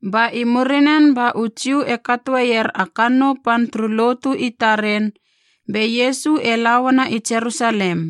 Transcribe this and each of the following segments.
Ba i murinen ba u Jiu e katoeier a kannou pan turu lotu i taren, be Iesu e la uana i Jerusalem.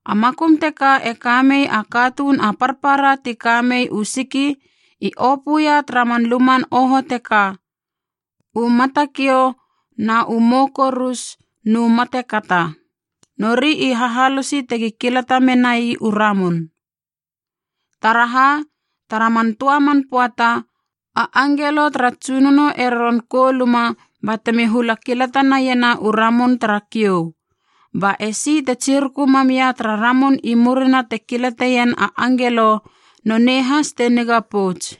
A makum teka e kamei a katuun a parpara ti ka mei u siki i opöia tara man luman oho teka, u matakiou, na u mou korus nu matekata. Nori i hahalosi tegi kilata menai u ramun. Taraha, tara man töa man pöata a angelo tara Tsunono e roron kouluma batemi hula kilatanaiena u ramun tara kiou. Ba esi te tsiruku mamia tara ramun i murina te kilateien a angelo nonei has te niga pouts.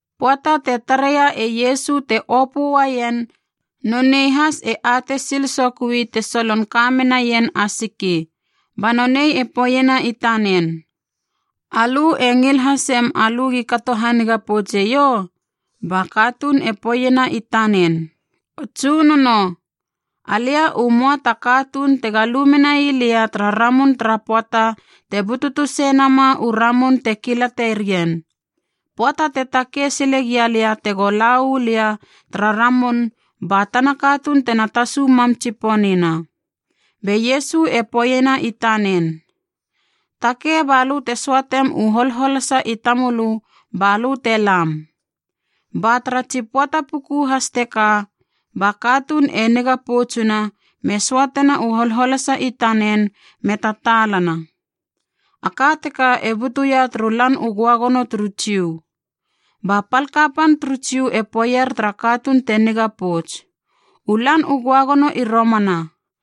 Pöata te tareia e Iesu te opö uaien nonei has e atei sil sokui te solon ka menaien a siki, ba nonei e poeiena i tanen, “Alö e ngil hasem alö gi kato haniga poutseiou?” Ba katuun e poeiena i tanen, “O Tsunono, alia u möa ta katuun tega lu menai lia tara ramun tara pöata te bututu sei nama u ramun te kilaterien. Pöata te takei silegia lia tego la uu lia tara ramun ba tana katuun tena tasu mam tsiponina.” Be Iesu e poeiena i tanen, “Takei balö te söatem u holholasa i tamölö balö te lam.” Ba tara tsi pöata puku has teka ba katuun e niga poutsuna me söatena u holholasa i tanen me tataalana. A ka teka e butuia turu Lan u Göagono turu Jiu. Ba pal kapan turu Jiu e poeier tara katuun te niga pouts, “U Lan u Göagono i romana.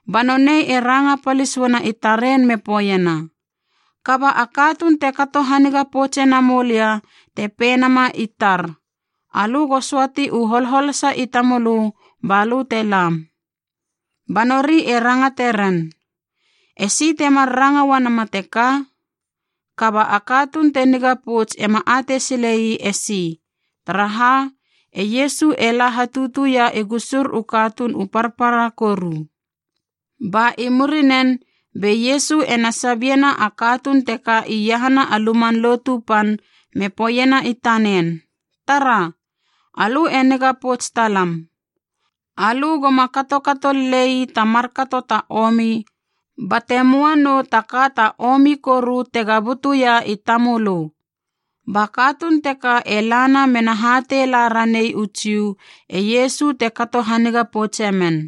Ba nonei e ranga palis uana i taren me poeiena, “Kaba a katuun te kato haniga poutse namou lia te pei nama i tar, ‘Alö go söati u holholasa i tamölö balö te lam.’” Ba nori e rangate ren, “Esi temar ranga uanama teka?” Kaba a katuun te niga pouts ema atei silei e si, taraha e Iesu e la hatutuia i gusur u katuun u parpara koru. Ba i murinen be Iesu ena sabiena a katuun teka iahana a Luman Lotu Pan me poeiena i tanen, “Tara, alö e niga pouts talam. Alö goma katokato lelei ta markato ta omi bate möa nou ta ka ta omi koru tega butuia i tamölö.” Ba katuun teka e lana mena hatei la ranei u Jiu, e Iesu te kato haniga poutse men.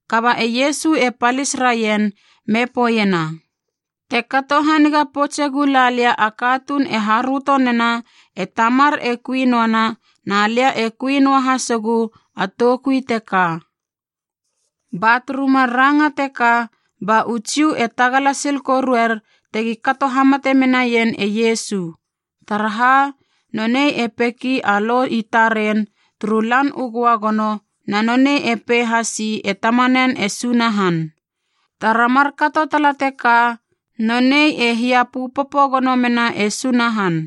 Kaba e Iesu e palis raien me poeiena, “Te kato haniga poutse gula lia a katuun e haröto nena e Tamar e kui noana na lia e kui noa hasegu a toukui teka.” Ba turu mar ranga teka ba u Jiu e tagala sil koruer tegi kato hamate menaien e Iesu, taraha nonei e peki a lo i taren turu Lan u Göagono na nonei e pei hasi e Tamanen e Sunahan. Tara markato tala teka, nonei e hiapöpopo gono mena e Sunahan.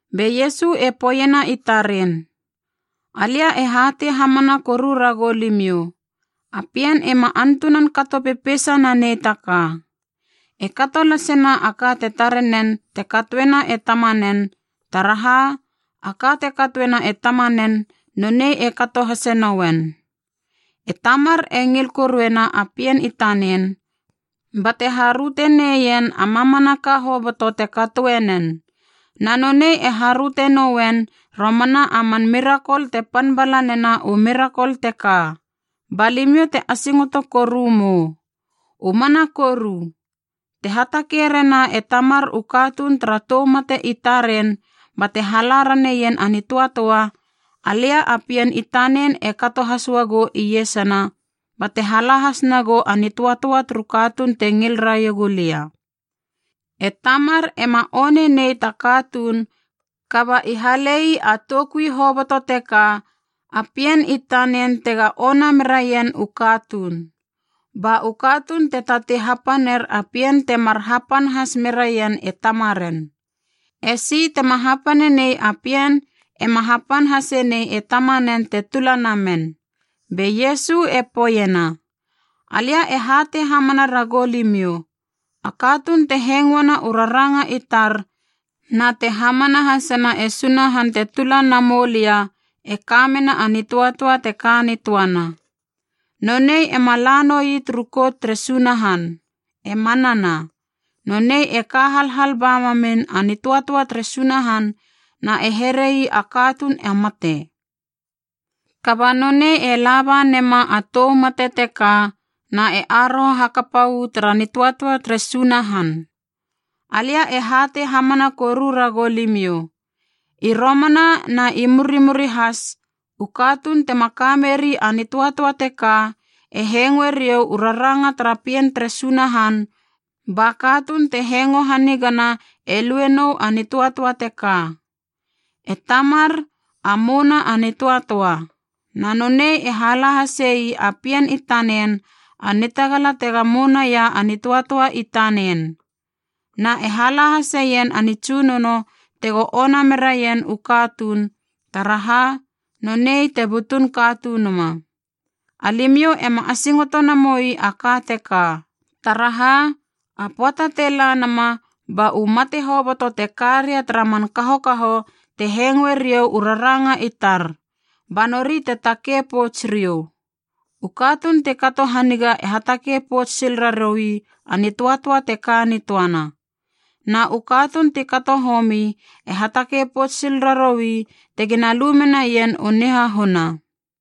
Be Iesu e poeiena i taren, “Alia e hatei hamana koru ragou limiou, a Pien ema antunan kato pepeisa nanei ta ka. E kato lasena a ka te tarenen te katoena e Tamanen, taraha a ka te katoena e Tamanen, nonei e kato hase nouen. E Tamar e ngil koruena a Pien i tanen, bate haröte neien a mamanaka hoboto te katoe nen. Na nonei e haröte noien romana a man mirakol te pan bala nena u mirakol teka, ba limiou te asingoto koru mou. U mana koru, te hatakei rena e Tamar u katuun tara tou mate i taren bate hala raneien a nitöatöa, alia a Pien i tanen e kato has uagou iesana bate hala has nagou a nitöatöa turu katuun te ngil raiegu lia. E Tamar ema one nei ta katuun kaba i halei a toukui hoboto teka a Pien i tanen tega ona meraien u katuun. Ba u katuun te tatei hapaner a Pien temar hapan has meraien e Tamaren. E si tema hapane nei a Pien ema hapan hase nei e Tamanen te tula namen.” Be Iesu e poeiena, “Alia e hatei hamana ragou limiou, a katuun te hengoena u raranga i tar na te hamana hasena e Sunahan te tula namoulia e ka mena a nitöatöa te ka nitöana. Nonei ema la noi turu kout tere Sunahan. E manana, nonei e ka halhal ba mamin a nitöatöa tere Sunahan na e herei a katuun a mate. Kaba nonei e laba nema a tou mate teka na e aroho hakapa uu tara nitöatöa tere Sunahan. Alia e hatei hamana koru ragou limiou, i romana na i murimuri has, u katuun tema ka meri a nitöatöa teka e hengoe riou u raranga tara Pien tere Sunahan, ba katuun te hengo hanigana e lue nou a nitöatöa teka. E Tamar, a mouna a nitöatöa, na nonei e hala hasei a Pien i tanen a nitagala tega mounaia a nitöatöa i tanen. Na e hala haseien a nitsunono tego ona meraien u katuun, taraha nonei te butun Katunuma. Alimiou ema asingoto namoi a ka teka, taraha a pöata te la nama ba u mate hoboto te ka ria tara man kahokaho te hengoe riou u raranga i tar, ba nori te takei pouts riou. U katuun ti kato haniga e hatakei pouts sil raroui a nitöatöa te ka nitöana, na u katuun ti kato homi e hatakei pouts sil raroui tegina lu menaien u nihahuna.”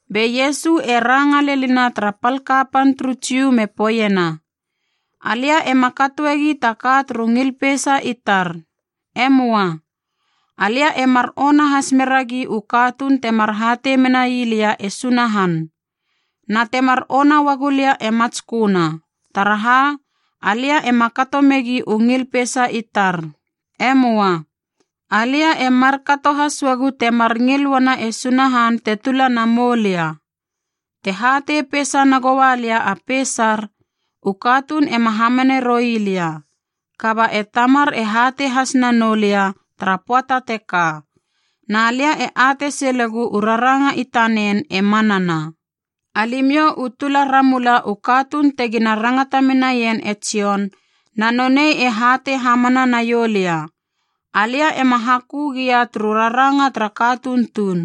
Be Iesu e ranga lenina tara pal kapan turu Jiu me poeiena, “Alia ema katoegi ta ka turu ngil peisa i tar. E möa. Alia e mar ona has meragi u katuun temar hatei mena ii lia e Sunahan. Na temar ona uagu lia e matsköna, taraha alia ema kato megi u ngil peisa i tar. E möa. Alia e markato has uagu temar ngil uana e Sunahan te tula na moulia. “Te hatei peisa nagoua lia a peisar, u katuun ema hamane roi lia. Kaba e Tamar e hatei has nanou lia tara pöata teka, na lia e atei silegu u raranga i tanen e manana. “Alimiou u tula ramula u katuun tegina rangata menaien e Jon, na nonei e hatei hamana naiou lia. Alia ema hakö gia turu raranga tara katuun tuun.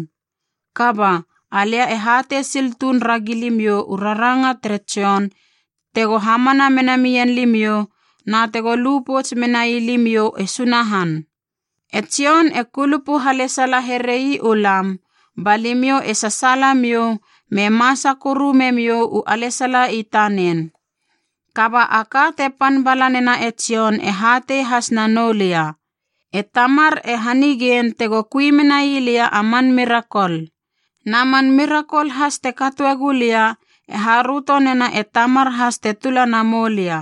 Kaba, alia e hatei sil tuun ragi limiou u ranga tere Jon tego hamana mena mien limiou na tego lu pouts menai limiou e Sunahan. E Jon e kulupu halesala herei u lam, ba limiou e sasaala miou me masa koru memiou u alesala i tanen. “Kaba a ka te pan bala nena e Jon e hatei has nanou lia. E Tamar e hanigein tego kui menai lia a man mirakol. Na man mirakol has te katoe gulia e haröto nena e Tamar has te tula na moulia.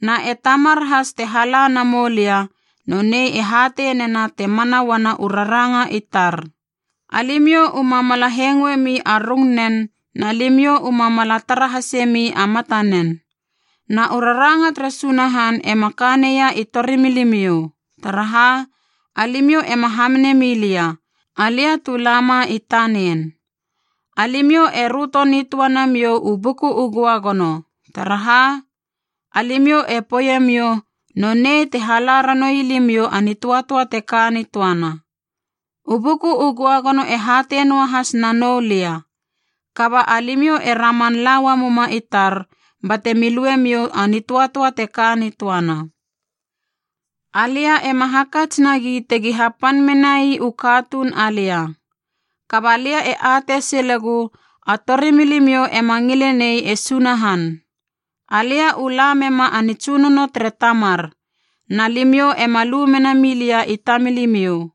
Na e Tamar has te hala na moulia, nonei e hatei nena te mana uana u raranga i tar. Alimiou uma mala hengoemi a rungnen na limiou uma mala tara hasemi a matanen. Na u raranga tere Sunahan ema ka neia i torimilimiou, taraha alimiou ema hamane milia, alia tu lama i tanen. Alimiou e röto nitöa namiou u Buku u Göagono, taraha alimiou e poeiemiou nonei te hala ranoui limiou a nitöatöa te ka nitöana. U Buku u Göagono e hatei noahas na nou lia. Kaba alimiou e raman la uamuma i tar bate mi luemiou a nitöatöa te ka nitöana. “Alia ema hakats nagi tegi hapan menai u katuun alia. Kaba lia e atei silegu a torimilimiou ema ngile nei e Sunahan. Alia u la mema a nitsunono tere Tamar, na limiou ema lu mena milia i tamilimiou.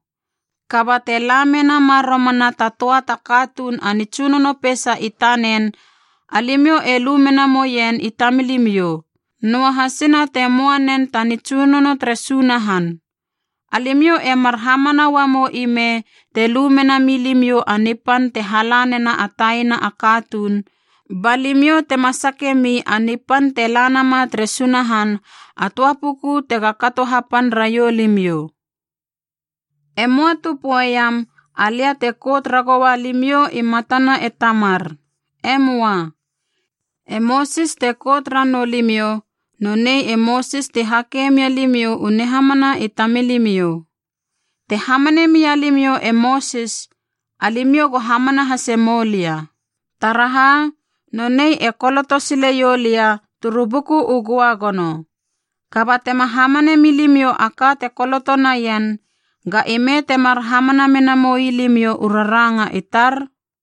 Kaba te la menama romana ta töa ta katuun a nitsunono peisa i tanen, alimiou e lu mena moien i tamilimiou, noahasina te möa nen ta nitsunono tere Sunahan. Alimiou e mar hamana uamou i me te lu mena mi limiou a nipan te hala nena a taina a katuun, ba limiou tema sake mi a nipan te la nama tere Sunahan a töa puku tega kato hapan raiou limiou. “E möa tu poeiam alia te kout ragoua limiou i matana e Tamar. E möa. E Mosis te kout ranou limiou, nonei e Mosis ti hake mia limiou u nihamana i tamilimiou. Te hamane mia limiou e Mosis, alimiou go hamana hase moulia. Taraha, nonei e koloto sileiou lia turu Buku u Göagono. Kaba tema hamane milimiou a ka te koloto naien, ga ime temar hamana menamoi limiou u raranga i tar?”